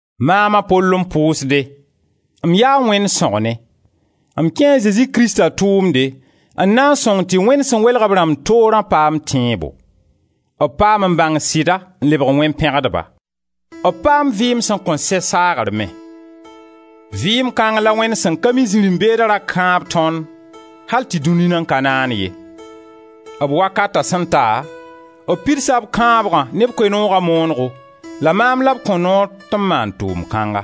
Maam a Pol n pʋʋsde. M yaa Wẽnd sõgne; m kẽe a Zezi Krista tʋʋmde n na n sõng tɩ Wẽnd sẽn welg b rãmb toorã paam tẽebo. B paam n bãng sɩda n lebg wẽn-pẽgdba. B paam vɩɩm sẽn kõn sɛ saagre me. Vɩɩm kãng la Wẽnd sẽn ka mi zirẽ-beeda ra kãab tõnd al tɩ dũni nan ka naan ye. B wakata sẽn ta, b pidsa b kãabgã ne b Koe-nooga moonego la maam la b kõ noor tɩ m maan tʋʋm-kãnga.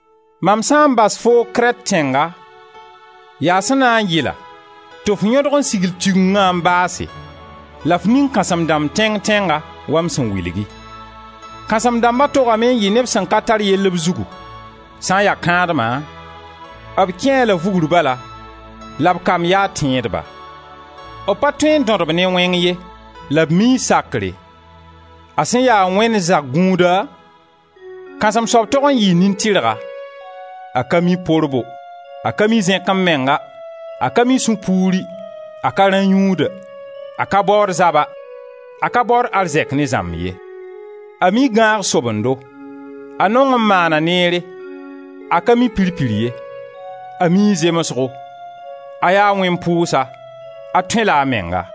Mam sã n bas foo Krɛt tẽnga yaa sẽn na n yɩla tɩ f yõdg n sigl Tigenga n baase la f ning kãsem-dãmb tẽng-tẽnga wa m sẽn wilgi. Kãsem-dãmba togame n yɩ neb sẽn ka tar yell b zugu; sã n ya kãadma, b kẽe-a la vugr bala la b kamb yaa tẽedba; b pa tõe n dõd-b ne wẽng ye, la b mii sakre. A sẽn ya Wẽnd zag-gũuda, kãsem-soab tog n yɩɩ nin-tɩrga; a ka mi porbo, a ka mi zẽk-m-menga, a ka mi sũ-puuri, a ka rã-yũuda, a ka baood zaba, a ka baood arzɛk ne zãmb ye. A mii gãag-sobendo, a nong n maana neere, a ka mi pir-pir ye, a mii zemsgo, a yaa wẽn-pʋʋsa, a tõe-la a menga.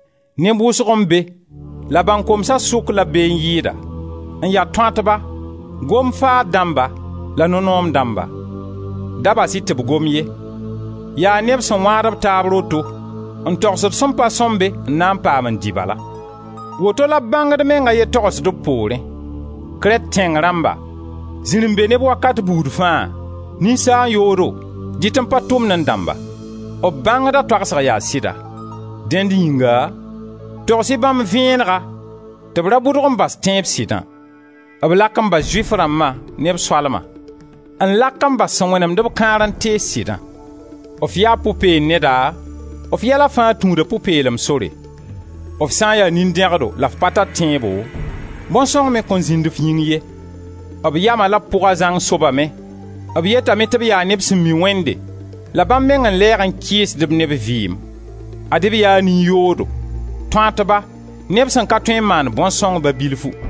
Neb wʋsg n be, la bãnkomsa sʋk la b be n yɩɩda, n ya tõatba, gom-faad-dãmba, la no-noom-dãmba. Da bas-b tɩ b gom ye. Yaa neb sẽn wãad b taab roto, n togsd sẽn pa sõmbe n na n paam n dɩ bala. Woto la b bãngd meng a ye togsd b poorẽ: «Krɛt tẽng rãmba, zirẽ-be-neb wakat buud fãa, ninsaan-yoodo, dɩt-n-pa-tʋmnẽ-dãmba.» B bãngda toagsg yaa sɩda. Dẽnd yĩnga, togs-y bãmb vẽenega tɩ b ra bʋdg n bas tẽeb sɩdã. B lak n bas Zʋɩf rãmba ne b soalma, n lak n bas sẽn wẽnemd-b kãar n tees sɩdã. F ya pʋ-peen-neda, f yɛla fãa tũuda pʋ-peelem sore; f sã n ya nin-dẽgdo la f pa tar tẽebo, bõn-sõng me kõn zĩnd f yĩng ye. B yama la b pʋga zãng sobame. B yetame tɩ b yaa neb sẽn mi Wẽnde, la bãmb meng n lɛɛg n kɩɩsd-b ne b vɩɩm: ad-y b yaa nin-yoodo, tõatba, neb sẽn ka tõe n maan bõn-sõng ba bilfu.